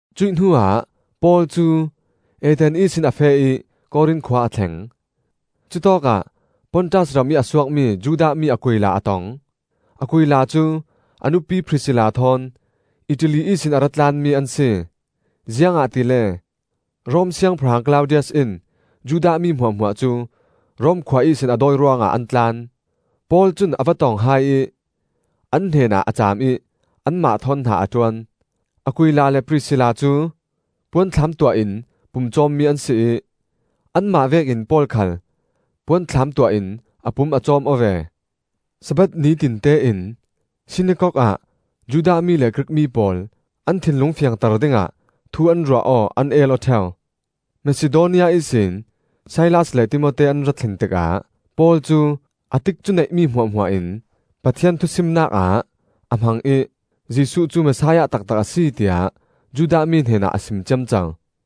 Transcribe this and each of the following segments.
Cuih hnuah Paul cu Athens ihsin a feh ih Korin khua a thleng. Cutawkah Pontus ramih a suakmi Judah mi Aquila a tong. Aquila cu a nupi Prisilla thawn Italy ihsin a ra tlanmi an si. Ziangahtile Rom siangpahrang Klaudius in Judah mi hmuahhmuah cu Rom khua ihsin a dawi ruangah an tlan. Paul cun a va tong hai ih, an hnenah a caam ih anmah thawn hna a ṭuan. Aquila le Prisilla cu puanthlam tuah in pumcawmmi an si ih anmah vekin Paul khal puanthlam tuah in a pum a cawm aw ve. Sabbath nitinte in sinakok ah Judah mi le Grik mi pawl an thinlung fiangter dingah thu an ruah aw, an el aw ṭheu. Masidonia ihsin Silas le Timote an ra thlen tikah Paul cu a tikcu neihmi hmuahhmuah in Pathian thusimnak ah a hmang ih Jesuh cu Messiah taktak a si tiah Judah mi hnenah a sim ciamco.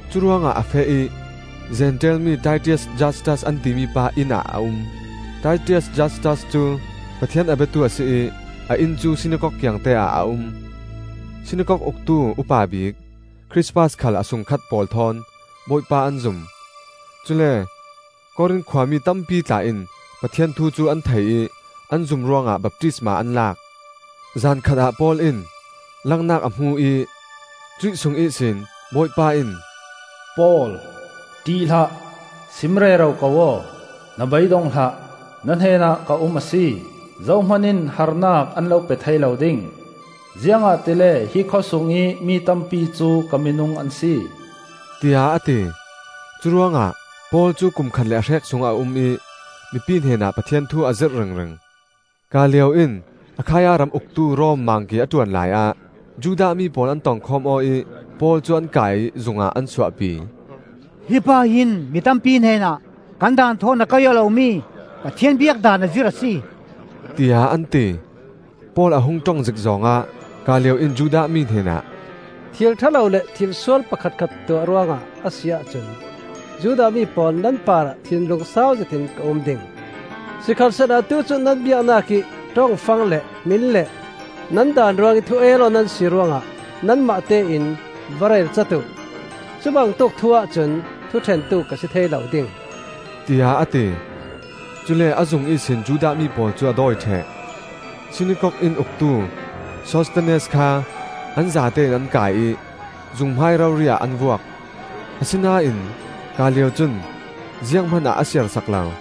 Curuangah a feh ih Zentail mi Titias Jastas an timi pa inn ah a um; Titias Jastas cu Pathian a biatu a si ih a inn cu sinakok kiangte ah a um. Sinakok uktu upa bik Krispas khal a sungkhat pawl thawn Bawipa an zum; cule Korin khuami tampi tla in Pathian thu cu an thei ih an zum ruangah baptisma an lak. Zankhat ah Paul in langnak a hmu ih cuih sung ihsin Bawipa in, “Paul, ṭih hlah! Sim rero ko aw, na bei dong hlah! Na hnenah ka um a si. Zohman in harnak an lo pe thei lo ding, ziangahtile hi khawsungih mi tampi cu ka minung an si,” tiah a ti. Curuangah Paul cu kum khat le a hrek sung a um ih mipi hnenah Pathian thu a zirh ringring. Gallio in Akhaia ram uktu Rom Mangki a ṭuan laiah Judah mi pawl an tongkhawm aw ih Paul cu an kai ih zungah an suahpi. “Hi pa hin mi tampi hnenah kan daan thawn a kaih aw lomi Pathian biak daan a zirh a si,” tiah an ti. Paul a hung ṭong zik zawng ah Gallio in Judah mi hnenah, “Thil ṭha lo le thil sual pakhatkhat tuah ruangah a si ahcun Judah mi pawl nan parah thinlung sau zetin ka um ding. Sikhalsehla atu cu nan biaknak ih ṭong fang le hmin le nan daan ruangih thu el aw nan si ruangah nanmah tein va relcat uh! Cubangtuk thu-ah cun thuṭhentu ka si thei lo ding,” tiah a ti. Cule a zung ihsin Judah mi pawl cu a dawi ṭheh. Sinakok inn uktu Sosthenes kha an zatein an kai ih zung hmai rori ah an vuak. Asinain Gallio cun zianghman ah a siarsak lo.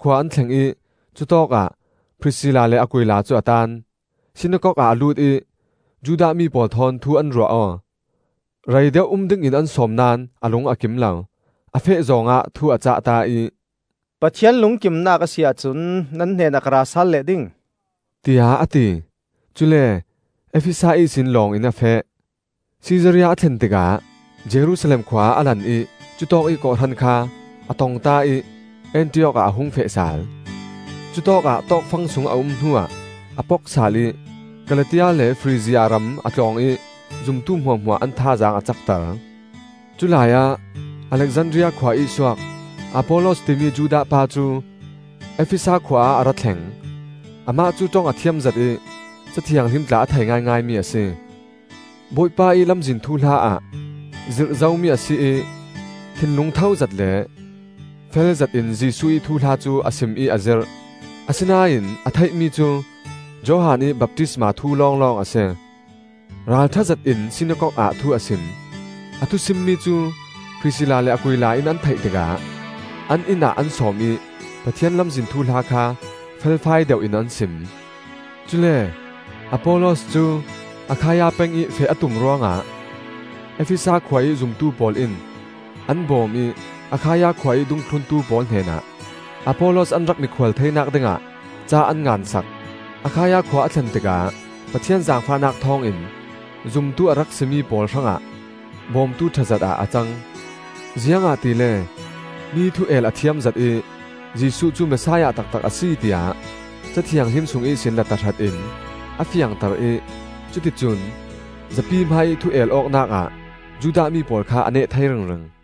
Efesa khua an thleng ih cutawk ah Prisilla le Aquila cu a taan. Sinakok ah a lut ih Judah mi pawl thawn thu an ruah aw. Rei deuh um dingin an sawm naón a lung a kim lo. A feh zawng ah thu a cahta ih, “Pathian lungkimnak a si ahcun nan hnenah ka ra sal leh ding,” tiah a ti. Cule Efesa ihsin lawng in a feh. Sisaria a thlen tikah Jerusalem khua ah a lan ih cutawkih kawhhran kha a tongta ih Antiok ah a hung feh sal. Cutawkah tawkfang sung a um hnuah a pok sal ih Kalatia le Frizia ram a tlawng ih zumtu hmuahhmuah an thazaang a cakter. Culai ah Alexandria khua ih suak, Apollos timi Judah pa cu Efesa khua ah a ra thleng. Amah cu ṭong a thiam zet ih Ca Thianghlim tla a thei ngaingaimi a si. Bawipa ih Lamzin thuhla ah zirh zomi a si ih, thinlung thozet le felzetin Jesuh ih thuhla cu a sim ih a zirh. Asinain a theihmi cu Johan ih baptisma thu lawnglawng a si. Ralṭha zetin sinakok ah thu a sim. A thusimmi cu Prisilla le Aquila in an theih tikah an inn ah an sawm ih Pathian Lamzin thuhla kha felfai deuh in an sim. Cule Apollos cu Akhaia peng ih feh a tum ruangah Efesa khua ih zumtu pawl in an bawm ih Akhaia khua ih dungthluntu pawl hnenah Apollos an rak mikhual theinak dingah ca an ngansak. Akhaia khua a thlen tikah Pathian zaangfahnak thawngin zumtu a rak si mi pawl hrangah bawmtu ṭhazet ah a cang. Ziangahtile mi thu el a thiamzet ih Jesuh cu Messiah taktak a si, tiah Ca Thianghlim sung ihsin la tahrat in a fiangter ih cuticun zapi hmaiih thu el awknak ah Judah mi pawl kha a neh thei ringring.